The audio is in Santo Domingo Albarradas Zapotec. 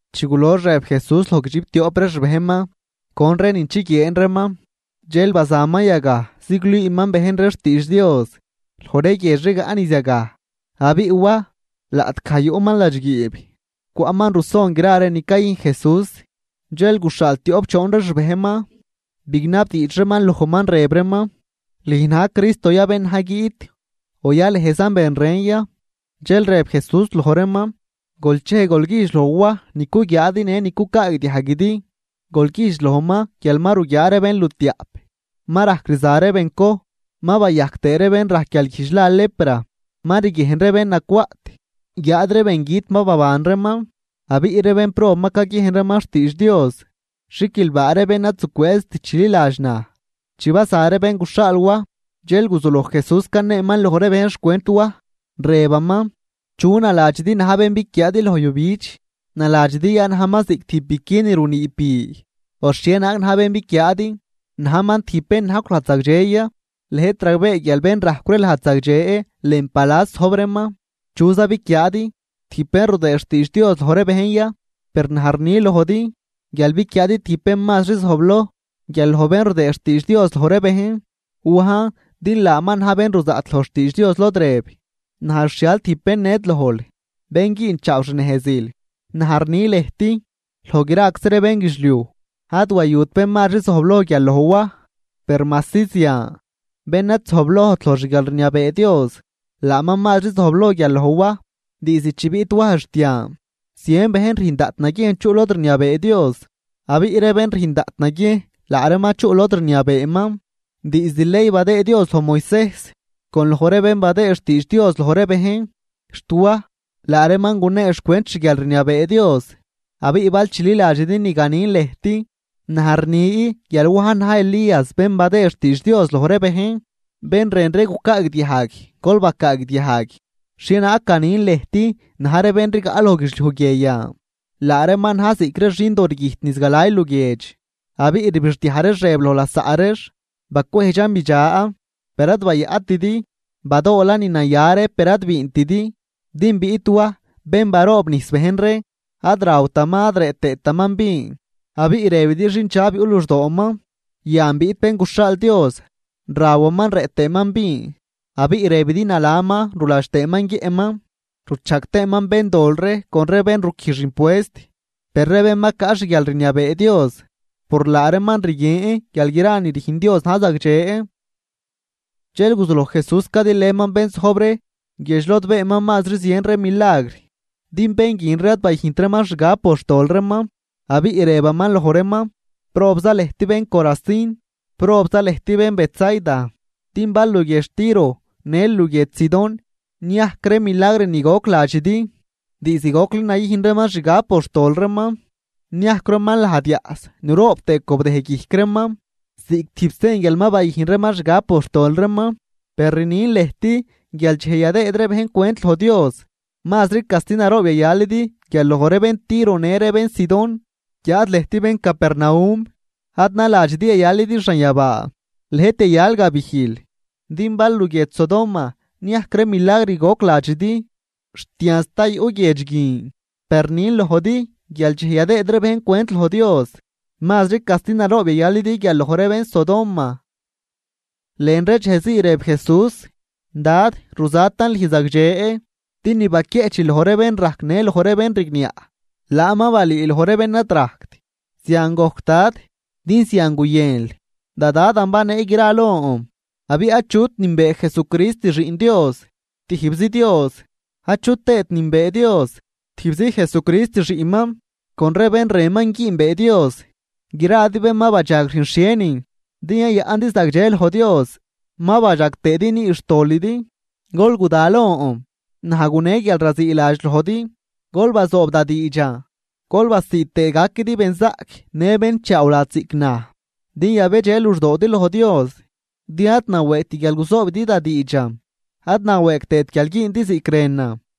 Chi gulox rëb Jesús loj guidxiptioꞌp ree xbejnman con ree nin chiguieen reeman, dxel bazaman yagaj ziglüüman bejn ree xtiidx Dios loj ree guiedx rigaꞌ niz yagaj. Abiꞌ Waj, laꞌtgaj yuꞌman ladxguiib, cwaꞌman ruson gra ree ni cayüjn Jesús. Dxel guxhaal tioꞌp choon ree xbejnman, bignabdiidx reeman lojman, rëb reeman: ―¿Lüj na̱j Cristo ya bén na̱j guiꞌt, o yalëjzan ben ren ya? Dxel rëb Jesús loj reeman: ―Gol chej gol güjdx loj Waj ni cuguiaadi në ni cucaagdiajguidi. Gol güjdx lojman guial ma ruguiaa ree bénlutiaꞌp, ma rajc rza ree bencoj, ma bayajc tëë ree bén rajc guialguijdx la lepra, ma riguiejn ree bén nacwaꞌt guiáad ree bengüt ma baban reeman, abiꞌ ree bénprob ma caguiejn reeman xtiidx Dios. Xiquilbaa ree bén ad zucwëëzt chililadx naj. Chi baza ree bén guxhaal Waj, dxel guzuloj Jesús caneeman loj ree bejn xcwent Waj, rëbaman: ―¿Chu naladxidi na̱j bén biquiaadi loj yujbidx? ¿Naladxidi ya najman ziꞌc tijb biqui ni runiib bi? ¿O xhienaag na̱j bén biquiaadi? ¿Najman tijb bén najcw lajd zagdxe ya? Lëjt ragbee guial bén rajcw ree lajd zagdxe lën palas zojb reeman. ¿Chuza biquiaadi? ¿Tijb bén rudëë xtiidx Dios loj ree bejn ya? Per naj rni lojdi guial biquiaadi tijb bén mazri zojbloj guial loj bén rudëëd xtiidx Dios loj ree bejn. Wajn din laaman naj ben ruzaꞌt loj xtiidx Dios lod rëb: Naj rxhial tijb bén ned lojl, ben güünchaaw xnejzil. Naj rni lëjt, loj graczi ree bénguidxliuj, ad wayut bén mazri zojbloj guial loj Waj. Per majsi zian, bén ad zojblojt loj xguialrniabee Dios, laaman mazri zojbloj guial loj Waj. ’Diizd chi biꞌt Waj xt yan, zien bejn rüjn daꞌt naguiejn chuꞌ lod rniabee Dios. Abiꞌ ree bén rüjn daꞌt naguiejn laa reeman chuꞌ lod rniabeeman. Diizd ley badëë Dios loj Moisejs con loj ree bén badëë xtiidx Dios loj ree bejn, xt Waj, laa reeman gunee xcwent xguialrniabee Dios. Abiꞌ bal chililadxidi ni ganin lëjt, naj rni guial Wajn na̱j Elías bén badëë xtiidx Dios loj ree bejn. Bén rën ree gucaagdiajg, gol bacaagdiajg. ’¿Xhienaag ganin lëjt na̱j ree bén rigaꞌ loj guidxliuj guie yan? Laa reeman na̱j ziꞌc ree xindoo rguijt niz galay luguiedx, abiꞌ rbixdiaj reex rëb loj lasaꞌ reex: “Bacwejdxan bidxa, per ad bayaꞌtidi, badoolan ni naya ree per ad biintidi.” Din biꞌt Waj bén baroobnijs bejn ree, ad rawtaman ad rëꞌ tëëtaman vin, abiꞌ rëbidi xindxab yuꞌ luxdooman. Yan, biꞌt Bén guxhaal Dios, rawaman rëꞌ tëëman vin abiꞌ rëbidi nalaman ruladx tëëman guiëꞌman, ruchajg tëëman béndol ree con ree bén ruquijx impuest. Per ree bén ma caꞌ xguialrniabee Dios, por laa reeman rguien guial gra ni rüjn Dios na̱j zagdxe. Dxel guzuloj Jesús cadilëman bén zojb ree guiedx lod beenman mazri zien ree milagr. Din bén guin ree ad bayüjnt reeman xgab por xtol reeman, abiꞌ rëbaman loj reeman: ―¡Probza lëjt bén Corazín! ¡Probza lëjt bén Betsaida! Din bal luguiedx Tiro në luguiedx Sidón niajc ree milagr ni goc ladxidi, diizd gocli nayüjn reeman xgab por xtol reeman, niajcw reeman lajd yaꞌs nuroob tëë cobdëj guijc reeman ziꞌc tijb sen guial ma bayüjn reeman xgab por xtol reeman. Per rnin lëjt guial dxej yadëëd ree bejn cwent loj Dios, mazri casti naroob yayalidi guial loj ree bén Tiro në ree bén Sidón. Guiáad lëjt bén Capernaum, ad naladxidi yayalidi xanyabaa, lëjt yayal gabijl. Din bal luguiedx Sodoma niajc ree milagr goc ladxidi, xt yan sta yuꞌ guiedx guin. Per rnin lojdi guial dxej yadëëd ree bejn cwent loj Dios, mazri casti naroob yayalidi guial loj ree bén Sodoma. Lën ree dxejzii rëb Jesús: ―Dad, ruzatan lüj zagdxe, din ni baquieꞌchil loj ree bén rajc në loj ree bén rigniaꞌ, laan ma balüül loj ree bén ad rajct. Zian gojc Dad, din zian guyënl. ’Da Dadan banee gra lon. Abiꞌ achut nünbee Jesucrist xiꞌn Dios, tijbzi Dios, achu tëët nünbee Dios, tijbzi Jesucrist xiꞌnman, con ree bén rënman güünbee Dios. Gradi, bén ma badxag rüjn xhienin din yayaꞌndi zagdxe loj Dios, ma badxag tëëdi nüü xtolidi. Gol guda lon, naj gune guialraziiladx lojdi. Gol bazoob da diidxan, gol basiid tëë gaquidi benzaꞌc në bén chaawladx ziꞌc naj, din yabedxe luxdoodi loj Dios. Din ad nawëëgt guial guzoobidi da diidxan, ad nawëëg tëët guial güündi ziꞌc rënan.